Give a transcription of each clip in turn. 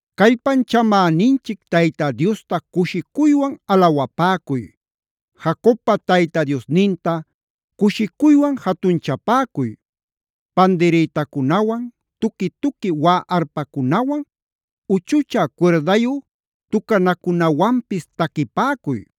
Callpanchamäninchic Tayta Diosta cushicuywan alawapäcuy. Jacobpa Tayta Diosninta cushicuywan jatunchapäcuy. Pandirïtacunawan, tuqui-tuqui waꞌä arpacunawan, uchuchä cuirdayu tucanacunawanpis taquipäcuy.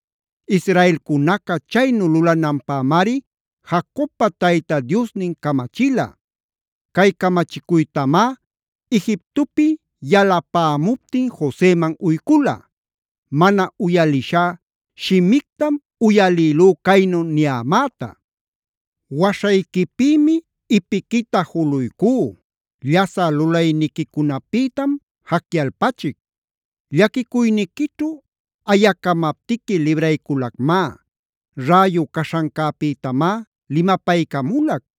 Israelcunaca chaynu lulananpämari Jacobpa Tayta Diosnin camachila. Cay camachicuytamá Egiptopi yalapämuptin Joseman uycula. Mana uyalishá shimictam uyalïlú caynu niyämäta: “Waśhayquipïmi ipiquita juluycú. Llasä lulayniquicunapïtam jacyalpachic. Llaquicuyniquićhu ayacamaptiqui librayculacmá. Räyu caśhancäpïtamá limapaycamulac.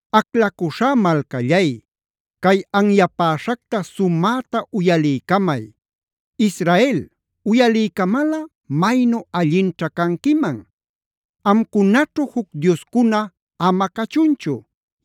“Aclacuśhá malcallay, cay anyapäśhacta sumäta uyaliycamay. Israel, uyaliycamalꞌa maynu allinćha canquiman. Amcunaćhu juc dioscuna ama cachunchu.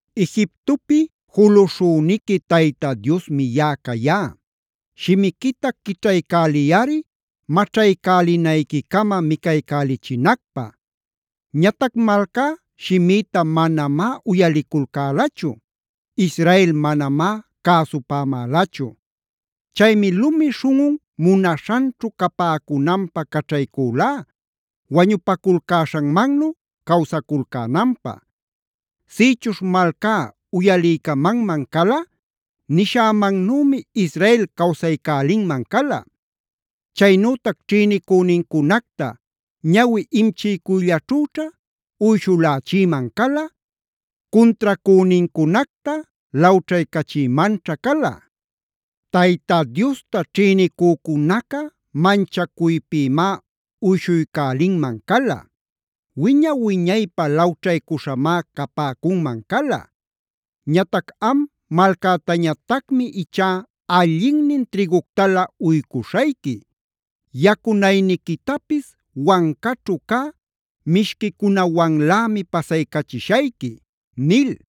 Egiptopi juluśhüniqui Tayta Diosmi yaꞌa cayá.d Shimiquita quićhaycäliyꞌari maćhaycälinayquicama micaycälichinacpä. “Ñatac malcá shimïta manamá uyaliculcälachu. Israel manamá cäsupämälachu. Chaymi lumi śhunꞌun munaśhanćhu capäcunanpä caćhaycülá, wañupaculcäśhanmannu cawsaculcänanpä. Sïchuśh malcá uyaliycamanman cala, nishämannümi Israel cawsaycälinman cala. Chaynütac ćhïnicünincunacta ñawi imchiycuyllaćhüćha uyshulächïman cala, cuntracünincunacta lawćhaycachïmanćha cala. Tayta Diosta ćhïnicücunaca, manchacuypïmá uyshuycälinman cala. Wiña-wiñaypä lawćhaycuśhamá capäcunman cala. Ñatac am malcätañatacmi ichá allinnin trïguctalä uycuśhayqui. Yacunayniquitapis wancaćhu cä mishquicunawanlämi pasaycachishayqui” nil.